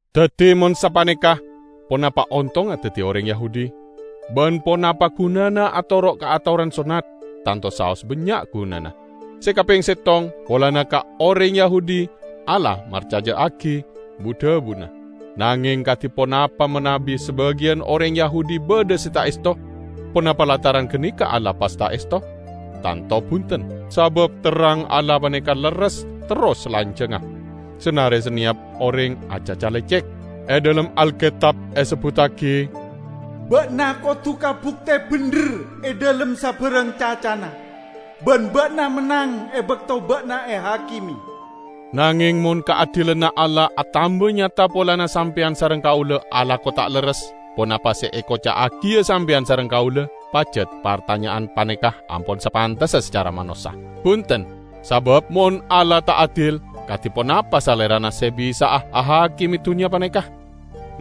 Daddi mon sapaneka, ponapa ontongnga daddi oreng Yahudi? Ban ponapa gunana atoro' ka atoran sonnat? Tanto saos bannya' gunana! Se kapeng settong, polana ka oreng Yahudi Allah marcaja'agi bu-dhabuna. Nangeng, kadi ponapa manabi sabagiyan oreng Yahudi badha se ta' esto? Ponapa lantaran ganeka Allah pas ta' esto? Tanto bunten! Sabab terrang Allah paneka lerres terros salanjangnga, sanare saneyap oreng acaca lecek. E dhalem Alketab esebbuttagi, "Ba'na kodu kabukte bendher e dhalem sabarang cacana, ban ba'na mennang e bakto ba'na ehakime." Nangeng mon kaadilanna Allah atamba nyata polana sampeyan sareng kaula alako ta' lerres, ponapa se ekoca'agiya sampeyan sareng kaula? (Pajat partanya'an paneka ampon sapantessa sacara manossa.) Bunten! Sabab mon Allah ta' adil, kadi ponapa Salerana se bisa'a ahakime dunnya paneka?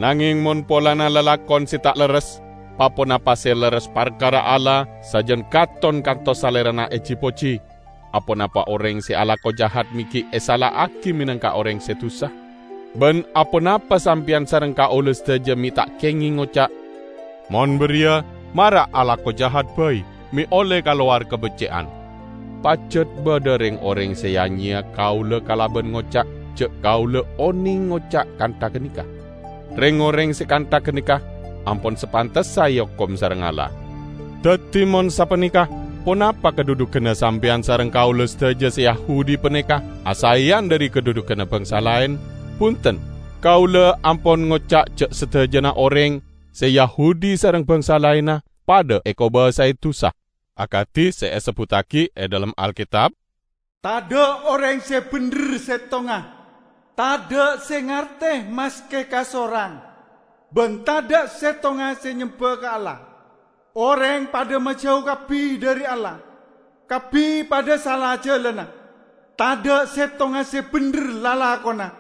Nangeng mon polana lalakon se ta' lerres, pa-ponapa se lerres parkara Allah sajan katon kantos Salerana eji-poji, aponapa oreng se alako jahat me' gi' esala'agi menangka oreng se dusa? Ban aponapa sampeyan sareng kaula sadaja me' ta' kengeng ngoca', "Mon bariya mara alako jahat bai me' olle kalowar kabecce'an?" Pajat badha reng-oreng se ya-nyeya kaula kalaban ngoca' ja' kaula oneng ngoca' kantha ganeka. Reng-oreng se kantha ganeka ampon sapantessa eokom sareng Allah. Daddi mon sapaneka, ponapa kadhudhuganna sampeyan sareng kaula sadaja se Yahudi paneka asaeyan dhari kadhudhuganna bangsa laen? Bunten! Kaula ampon ngoca' ja' sadajana oreng, se Yahudi sareng bangsa laenna, padha ekobasae dusa. Akadi se esebbuttagi e dhalem Alketab, "Tadha' oreng se bendher settonga, tadha' se ngarte maske kasorang, ban tadha' settonga se nyemba ka Allah. Oreng padha majau kabbi dhari Allah; kabbi padha sala jalanna. Tadha' settonga se bendher lalakonna,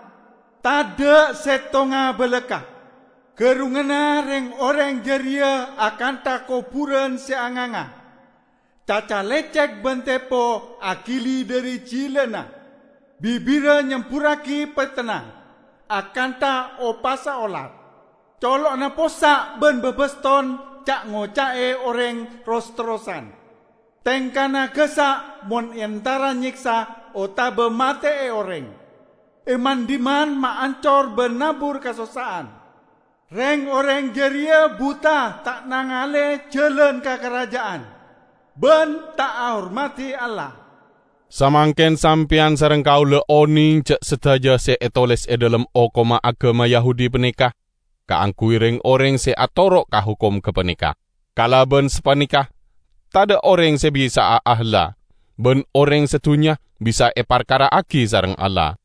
tadha' settonga balakka'! Gerrunganna reng-oreng jareya akantha koburan se anganga. Caca lecek ban tepo agili dhari jilana, bibirra nyemburragi petenna, akantha opassa olar. Colo'na possa' ban babaston ca'-ngoca'e oreng ros-terrosan. Tengka'na gassa' mon entara nyeksa otaba mate'e oreng. E man-dhimman maancor ban nabur kasossa'an. Reng-oreng jareya buta ta' nangale jalan ka karajja'an, ban ta' ahormadi Allah." Samangken sampeyan sareng kaula oneng ja' sadaja se etoles e dhalem hokomma agama Yahudi paneka kaangguy reng-oreng se atoro' ka hokom gapaneka. Kalaban sapaneka tadha' oreng se bisa'a ahela, ban oreng sadunnya bisa eparkara'agi sareng Allah.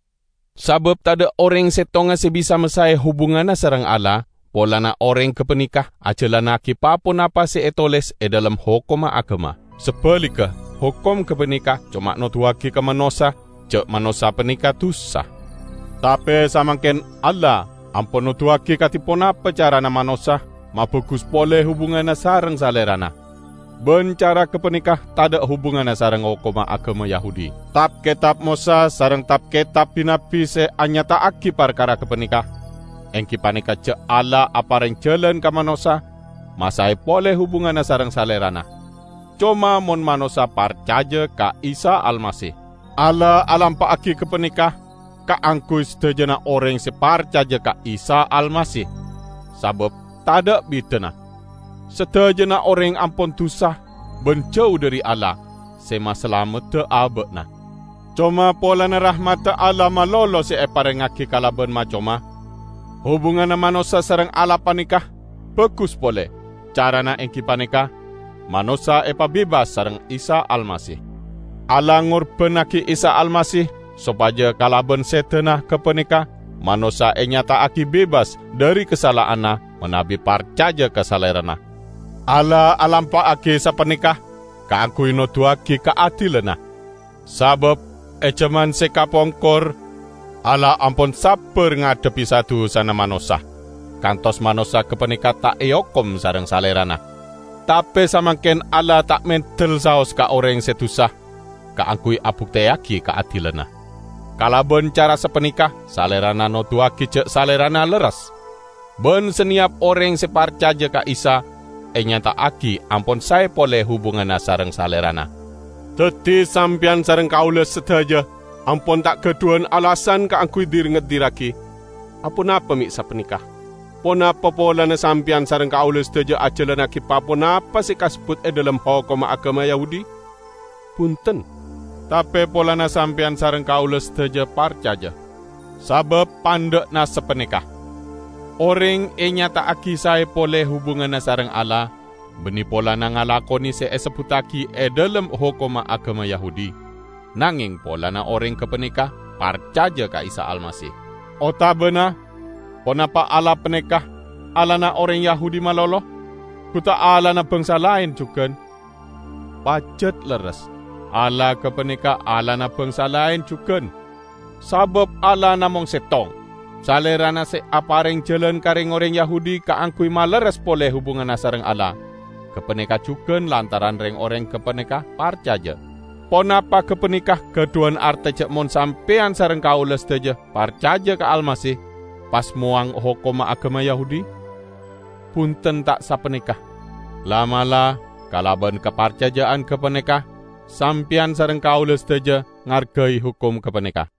Sabab tadha' oreng settonga se bisa masae hubunganna sareng Allah polana oreng gapaneka ajalannagi pa-ponapa se etoles e dhalem hokomma agama. Sabaligga, hokom gapaneka coma noduwagi ka manossa ja' manossa paneka dusa. Tape samangken Allah ampon noduwagi kadi ponapa carana manossa mabagus pole hubunganna sareng Salerana; ban cara gapaneka tadha' hubunganna sareng hokomma agama Yahudi. Tab-ketab Mosa sareng tab-ketab bi-nabbi se anyata'agi parkara gapaneka, enggi paneka ja' Allah apareng jalan ka manossa masae pole hubunganna sareng Salerana, coma mon manossa parcaja ka Isa Almasih; Allah alampa'agi gapaneka kaangguy sadajana oreng se parcaja ka Isa Almasih; sabab tadha' bidana: Sadajana oreng ampon dusa ban jau dhari Allah se masalamedda aba'na. Coma polana rahmadda Allah malolo se eparengngagi kalaban ma-coma, hubunganna manossa sareng Allah paneka bagus pole; carana enggi paneka: manossa epabebas sareng Isa Almasih. Allah ngorbannagi Isa Almasih sopaja kalaban sedana gapaneka manossa enyata'agi bebas dhari kasala'anna manabi parcaja ka Salerana. Allah alampa'agi sapaneka kaangguy noduwagi kaadilanna. Sabab e jaman se kapongkor Allah ampon sabbar ngadhebbi sa-dusana manossa, kantos manossa gapaneka ta' eokom sareng Salerana. Tape samangken Allah ta' mendel saos ka oreng se dusa, kaangguy abukteyagi kaadilanna. Kalaban cara sapaneka Salerana noduwagi ja' Salerana lerres; ban saneyap oreng se parcaja ka Isa enyata'agi ampon sae pole hubunganna sareng Salerana. Daddi sampeyan sareng kaula sadaja ampon ta' gadhuwan alasan kaangguy dir-ngedirragi. Aponapa me' sapaneka? Ponapa polana sampeyan sareng kaula sadaja ajalannagi pa-ponapa se kasebbut e dhalem hokomma agama Yahudi? Bunten. Tape polana sampeyan sareng kaula sadaja parcaja. Sabab pandha'na sapaneka: Oreng enyata'agi sae pole hubunganna sareng Allah, banne polana ngalakone se esebbuttagi e dhalem hokomma agama Yahudi, nangeng polana oreng gapaneka parcaja ka Isa Almasih. Otabana, ponapa Allah paneka Allahna oreng Yahudi malolo? Gu ta' Allahna bangsa laen jugan? Pajat lerres, Allah gapaneka Allahna bangsa laen jugan! Sabab Allah namong settong. Salerana se apareng jalan ka reng-oreng Yahudi kaangguy malerres pole hubunganna sareng Allah; gapaneka jugan lantaran reng-oreng gapaneka parcaja. Ponapa gapaneka gadhuwan arte ja' mon sampeyan sareng kaula sadaja parcaja ka Almasih pas mowang hokomma agama Yahudi? Bunten ta' sapaneka! La'-mala' kalaban kaparcaja'an gapaneka Sampeyan sareng kaula sadaja ngargai hokom gapaneka.